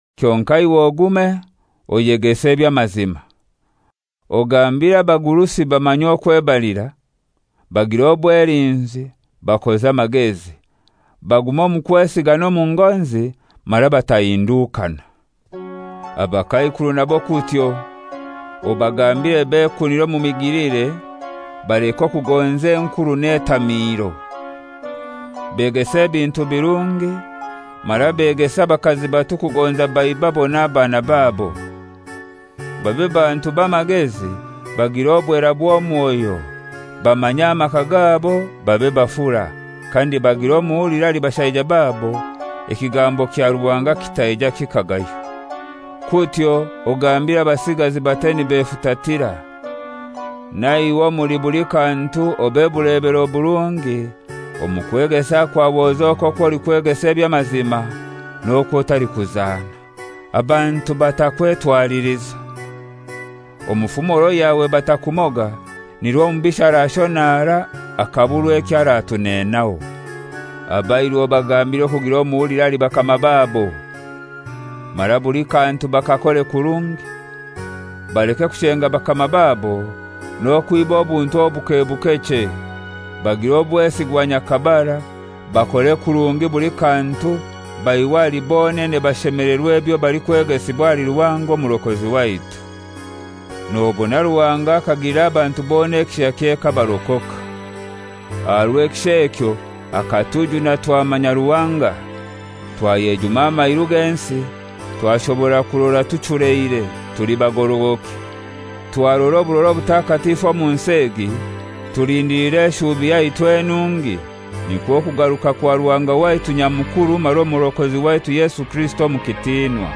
Kyonkai iwe ogume, oyegese eby'amazima. Ogambire abagurusi bamanye okwebalira, bagire obwelinzi, bakoze amagezi, bagume omu kwesiga n'omu ngonzi, mara batahindukana. Abakaikuru nabo kutyo, obagambire bekunire omu migilire, baleke okugonza enkuru n'etamiiro. Begese ebintu birungi, mara begese abakazi bato kugonza baibabo n'abaana babo. Babe bantu b'amagezi, bagire obwera bw'omwoyo, bamanye amaka gabo, babe bafura, kandi bagire omuhuliro ahali bashaija babo, ekigambo kya Ruhanga kitaija kikagaywa. Kutyo ogambire abasigazi bate nibefutatira. Na iwe omuli buli kantu obe bulebero burungi, omu kwegesa kwawe ozoke okwo olikwegesa eby'amazima, n'okwo otalikuzana, abantu batakwetwaliliza. Omu fumoro yawe batakumoga, nirwo omubisha arashonara akaburwa ekyo aratuneenaho. Abairu obagambire okugira omuhuliro ahali bakama babo, mara buli kantu bakakore kurungi. Baleke kushenga bakama babo, n'okwiba obuntu obuke buke chei, bagire obwesigwa nyakabara, bakore kurungi buli kantu baihwe ahali bonene bashemelerwe ebyo balikwegesibwa ahali Ruhanga Omurokozi waitu. Nobona Ruhanga akagilira abantu bona ekishakye kabarokoka. Aha rw'ekisha ekyo akatujuna twamanya Ruhanga, twayejuma amairu g'ensi, twashobora kurora tuchuleire, tuli bagorogoki, twarora oburora obutakatifu omu nsi egi, tulindiliire eshuubi yaitu enungi, nikwo kugaruka kwa Ruhanga waitu Nyamukuru mara Omurokozi waitu Yesu Kirisito omu kitinwa,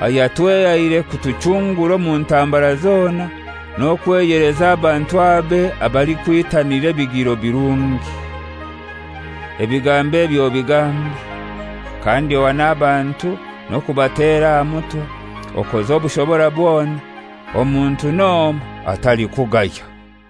ayatwehaire kutuchungura omu ntambara zona n'okweyeleza abantu abe abalikwitanira ebigiro birungi. Ebigambo ebi obigambe. Kandi ohane abantu n'okubatera aha mutwe, okoze obushobora bwona. Omuntu n'omoi atalikugaya.